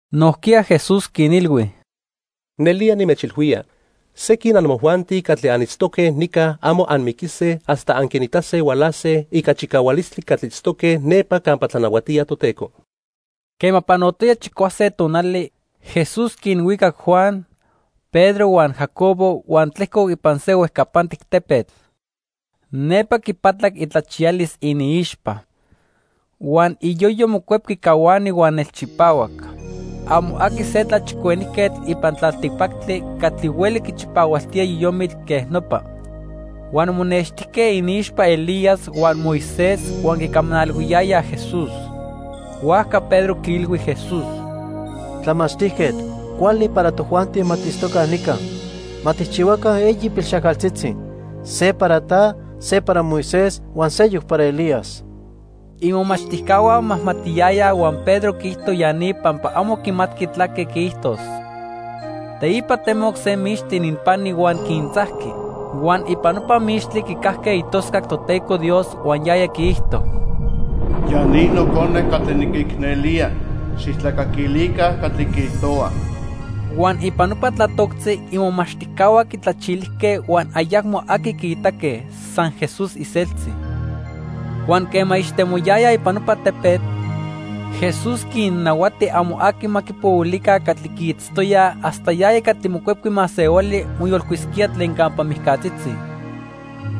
Nojquiya Jesús quinilhui: —Nelía nimechilhuía, sequin amojuanti catli anitztoque nica amo anmiquise hasta anquinitase hualase ica chicahualistli catli itztoque nepa campa tlanahuatía Toteco. Quema panotoya chicuase tonali, Jesús quinhuicac Juan, Pedro huan Jacobo huan tlejcoc ipan se huejcapantic tepetl. Nepa quipatlac itlachiyalis iniixpa. Huan iyoyo mocuepqui cahuani huan nelchipahuac. Amo aqui se tlachicuenijquetl ipan tlaltipactli catli hueli quichipahualtía yoyomitl quej nopa. Huan monextijque iniixpa Elías huan Moisés huan quicamanalhuiyayaj Jesús. Huajca Pedro quiilhui Jesús: —Tlamachtijquetl, cuali para tojuanti ma tiitztoca nica. Ma tijchihuaca eyi pilxajcaltzitzi; se para ta, se para Moisés, huan seyoc para Elías. Imomachtijcahua momajmatiyayaj huan Pedro quiijto ya ni pampa amo quimatqui tlaque quiijtos. Teipa temoc se mixtli ininpani huan quintzajqui. Huan ipan nopa mixtli quicajque itoscac Toteco Dios huan yaya quiijto: "Ya ni Nocone catli niquicnelía, xijtlacaquilica catli quiijtohua." Huan ipan nopa tlatoctzi imomachtijcahua quitlachilijque huan ayacmo aqui quiitaque, san Jesús iseltzi. Huan quema ixtemoyayaj ipan nopa tepetl, Jesús quinnahuati amo aqui ma quipohuilica catli quiitztoyaj hasta yaya catli Mocuepqui Masehuali moyolcuisquía tlen campa mijcatzitzi.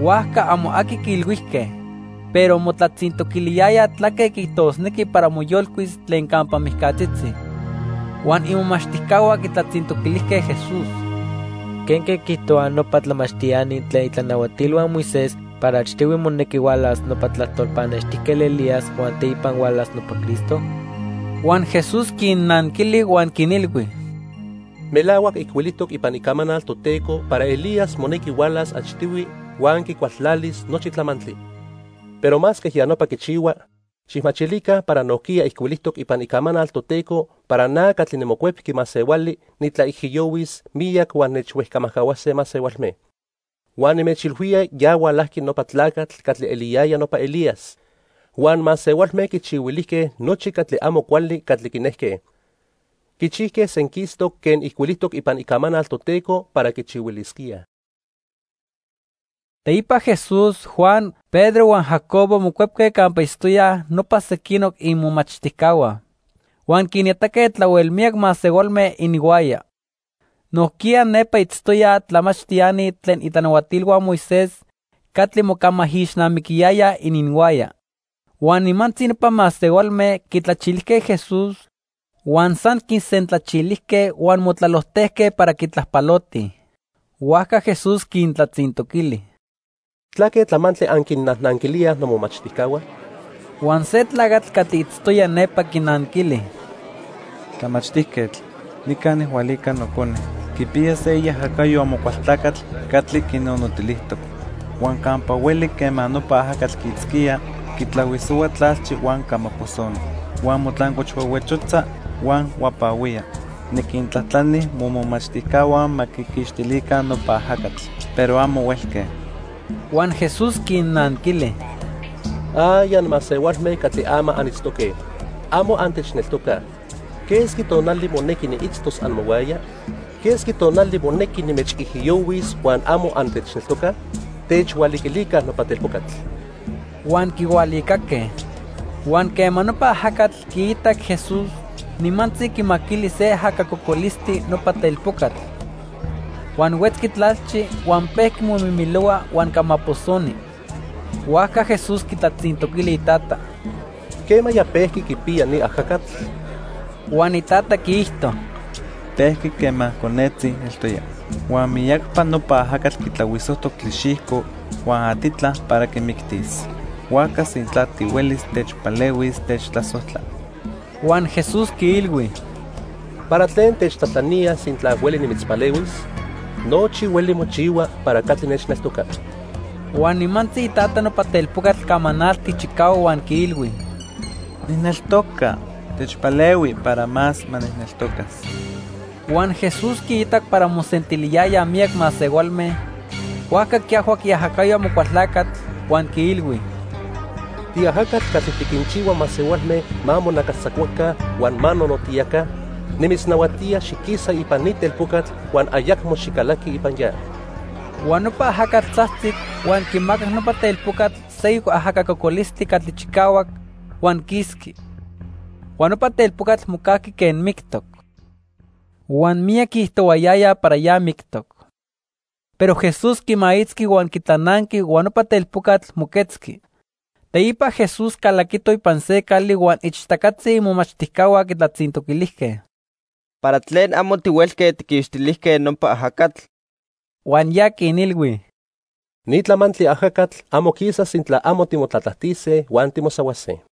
Huajca amo aqui quiilhuijque, pero motlatzintoquiliyayaj tlaque quiijtosnequi para moyolcuis tlen campa mijcatzitzi. Huan imomachtijcahua quitlatzintoquilijque Jesús: —¿Quenque quiijtohuaj nopa tlamachtiani tlen itlanahuatilhua Moisés para achtihui monequi hualas nopa tlajtol pannextijquetl Elías huan teipa hualas nopa Cristo? Huan Jesús quinnanquili huan quinilhui: —Melahuac ijcuilijtoc ipan Icamanal Toteco para Elías monequi hualas achtihui huan quicualtlalis nochi tlamantli. Pero masque ya nopa quichihua, xijmachilica para nojquiya ijcuilijtoc ipan Icamanal Toteco para na catli niMocuepqui Masehuali nitlaijiyohuis miyac huan nechhuejcamajcahuase masehualme. Huan nimechilhuía ya hualajqui nopa tlacatl catli eliyaya nopa Elías, huan masehualme quichihuilijque nochi catli amo cuali catli quinejque. Quichijque senquistoc quen ijcuilijtoc ipan Icamanal Toteco para quichihuilisquíaj. Teipa Jesús, Juan, Pedro huan Jacobo mocuepque campa itztoyaj nopa sequinoc imomachtijcahua. Huan quinitaque tlahuel miyac masehualme ininhuaya. Nojquiya nepa itztoyaj tlamachtiani tlen itlanahuatilhua Moisés catli mocamaijixnamiquiyayaj ininhuaya. Huan nimantzi nopa masehualme quitlachilijque Jesús, huan san quisentlachilijque huan motlalojtejque para quitlajpalotij. Huajca Jesús quintlatzintoquili: —¿Tlaque tlamantli anquinnajnanquilíaj nomomachtijcahua? Huan se tlacatl catli itztoya nepa quinanquili: —Tlamachtijquetl, nica nijhualica nocone. Quipiya se iajacayo Amocualtlacatl catli quinonotilijtoc. Huan campa hueli quema nopa ajacatl quiitzquía, quitlahuisohua tlalchi huan camaposoni. Huan motlancochhuehuechotza huan huapahuía. Niquintlajtlani momomachtijcahua ma quiquixtilica nopa ajacatl, pero amo huelque. Huan Jesús quinnanquili: —¡Ay, anmasehualme catli ama anitztoque! ¡Amo antechneltocaj! ¿Quesqui tonali monequi niitztos amohuaya? ¿Quesqui tonali monequi nimechijiyohuis huan amo antechneltocaj? ¡Techhualiquilica nopa telpocatl! Huan quihualicaque. Huan quema nopa ajacatl quiitac Jesús, nimantzi quimaquili se ajaca cocolistli nopa telpocatl. Huan huetzqui tlalchi, huan pejqui momimilohua huan camaposoni. Huajca Jesús quitlatzintoquili itata: —¿Quemaya pejqui quipiya ni ajacatl? Huan itata quiijto: —Pejqui quema conetzi eltoya. Huan miyacpa nopa ajacatl quitlahuisojtoc tlixijco huan atitla para quimictis. Huajca sintla tihuelis techpalehuis, techtlasojtla. Huan Jesús quiilhui: —¿Para tlen techtlajtlanía sintla hueli nimitzpalehuis? Nochi hueli mochihua para catli nechneltoca. Huan nimantzi itata nopa telpocatl camanaltic chicahuac huan quiilhui: —¡Nijneltoca! ¡Techpalehui para más ma nijneltocas! Huan Jesús quiitac para mosentiliyayaj miyac masehualme, huajca quiajhuac iajacayo Amocualtlacatl, huan quiilhui: —Tiajacatl catli tiquinchihua masehualme ma monacastzacuaca huan ma nonotiyaca, nimitznahuatía xiquisa ipan ni telpocatl huan ayacmo xicalaqui ipan ya. Huan nopa ajacatl tzajtzic, huan quimacac nopa telpocatl seyoc ajaca cocolistli catli chicahuac, huan quisqui. Huan nopa telpocatl mocajqui quen mictoc. Huan miyac quiijtohuayayaj para ya mictoc. Pero Jesús quimaitzqui huan quitlananqui huan nopa telpocatl moquetzqui. Teipa Jesús calaquito ipan se cali huan ichtacatzi imomachtijcahua quitlatzintoquilijque: —¿Para tlen amo tihuelque tijquixtilijque nopa ajacatl? Huan ya quinilhui: —Ni tlamantli ajacatl amo quisaj sintla amo timotlatlajtise huan timosahuase.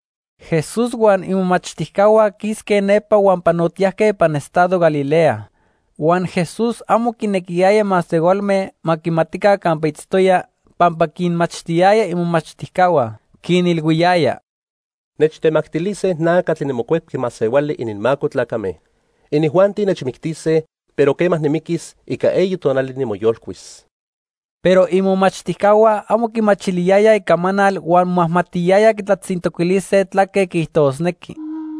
Jesús huan imomachtijcahua quisque nepa huan panotiyajque ipan estado Galilea. Huan Jesús amo quinequiyaya masehualme ma quimatica campa itztoya, pampa quinmachtiyaya imomachtijcahua. Quinilhuiyaya: —Nechtemactilise na catli niMocuepqui Masehuali ininmaco tlacame. Inijuanti nechmictise, pero quema nimiquis, ica eyi tonali nimoyolcuis. Pero imomachtijcahua amo quimachiliyayaj icamanal huan momajmatiyayaj quitlatzintoquilise tlaque quiijtosnequi.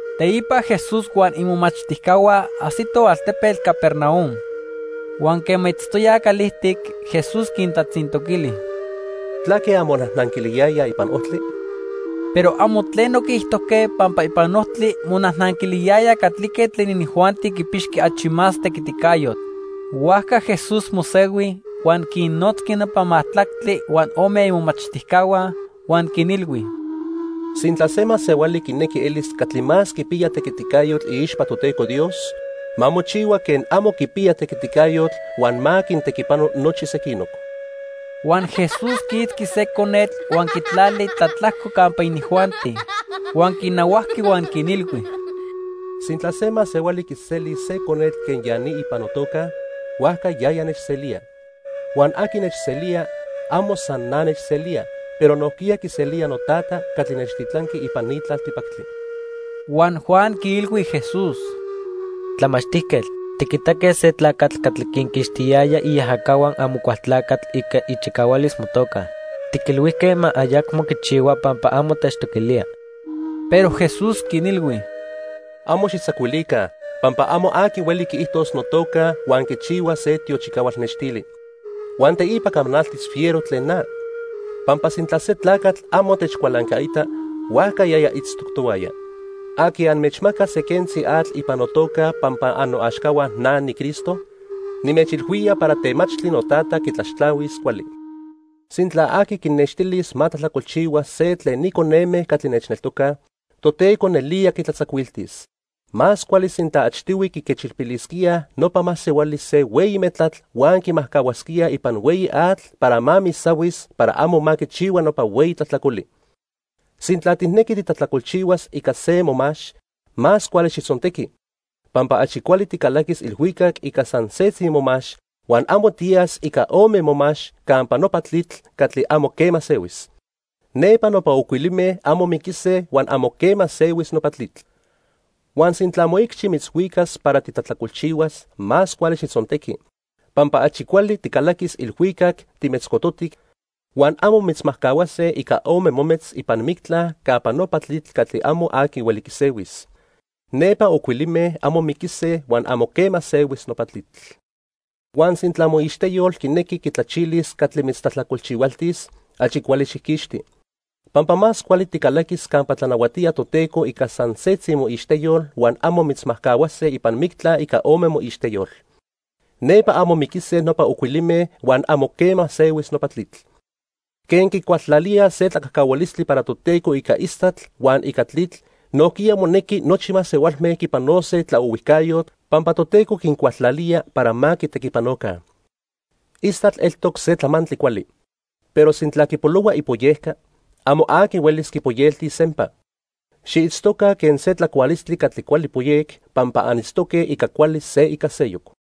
Teipa Jesús huan imomachtijcahua ajsitoj altepetl Capernaum. Huan quema itztoyaj calijtic, Jesús quintlatzintoquili: —¿Tlaque anmonajnanquiliyayaj ipan ojtli? Pero amo tleno quiijtojque pampa ipan ojtli monajnanquiliyayaj catlique tlen inijuanti quipixqui achi más tequiticayotl. Huajca Jesús mosehui huan quinnotzqui nopa majtlactli huan ome imomachtijcahua, huan quinilhui: —Sintla se masehuali quinequi elis catli más quipiya tequiticayotl iixpa Toteco Dios, ma mochihua quen amo quipiya tequiticayotl huan ma quintequipano nochi sequinoc. Huan Jesús quiitzqui se conetl huan quitlali tlatlajco campa inijuanti. Huan quinahuajqui huan quinilhui: —Sintla se masehuali quiselis se conetl quen ya ni ipan notoca, huajca yaya nechselía. Huan aqui nechselía, amo san na nechselía, pero nojquiya quiselía noTata catli nechtitlanqui ipan ni tlaltipactli. Huan Juan quiilhui Jesús: —Tlamachtijquetl, tiquitaque se tlacatl catli quinquixtiyaya iajacahua Amocualtlacatl ica ichicahualis motoca. Tiquilhuijque ma ayacmo quichihua pampa amo techtoquilía. Pero Jesús quinilhui: —Amo xijtzacuilica, pampa amo aqui hueli quiijtos notoca huan quichihua se tiochicahual nextili; huan teipa camanaltis fiero tlen na. Pampa sintla se tlacatl amo techcualancaita, huajca yaya itztoc tohuaya. Aqui anmechmacas se quentzi atl ipan notoca pampa annoaxcahua na, niCristo, nimechilhuía para temachtli noTata quitlaxtlahuis cuali. "Sintla aqui quinextilis ma tlajtlacolchihua se tlen ni coneme catli nechneltocaj, Toteco nelía quitlatzacuiltis. Más cuali sintla achtihui quiquechilpilisquíaj nopa masehuali se hueyi metlatl huan quimajcahuasquíaj ipan hueyi atl para ma misahuis para amo ma quichihua nopa hueyi tlajtlacoli. Sintla tijnequi titlajtlacolchihuas ica se momax, más cuali xijtzontequi. Pampa achi cuali ticalaquis ilhuicac ica san setzi momax, huan amo tiyas ica ome momax campa nopa tlitl catli amo quema sehuis. Nepa nopa ocuilime amo miquise huan amo quema sehuis nopa tlitl. Huan sintla moicxi mitzhuicas para titlajtlacolchihuas, más cuali xijtzontequi. Pampa achi cuali ticalaquis ilhuicac timetzcototic, huan amo mitzmajcahuase ica ome mometz ipan mictla campa nopa tlitl catli amo aqui hueli quisehuis. Nepa ocuilime amo miquise huan amo quema sehuis nopa tlitl. Huan sintla moixteyol quinequi quitlachilis catli mitztlajtlacolchihualtis, achi cuali xijquixti. Pampa más cuali ticalaquis campa tlanahuatía Toteco ica san setzi moixteyol huan amo mitzmajcahuase ipan mictla ica ome moixteyol. Nepa amo miquise nopa ocuilime huan amo quema sehuis nopa tlitl. "Quen quicualtlalíaj se tlacajcahualistli para Toteco ica istatl huan ica tlitl, nojquiya monequi nochi masehualme quipanose tlaohuijcayotl pampa Toteco quincualtlalía para ma quitequipanoca. Istatl eltoc se tlamantli cuali, pero sintla quipolohua ipoyeca, amo aqui huelis quipoyeltis sempa. Xiitztoca quen se tlacualistli catli cuali poyec, pampa anitztoque ica cuali se ica seyoc."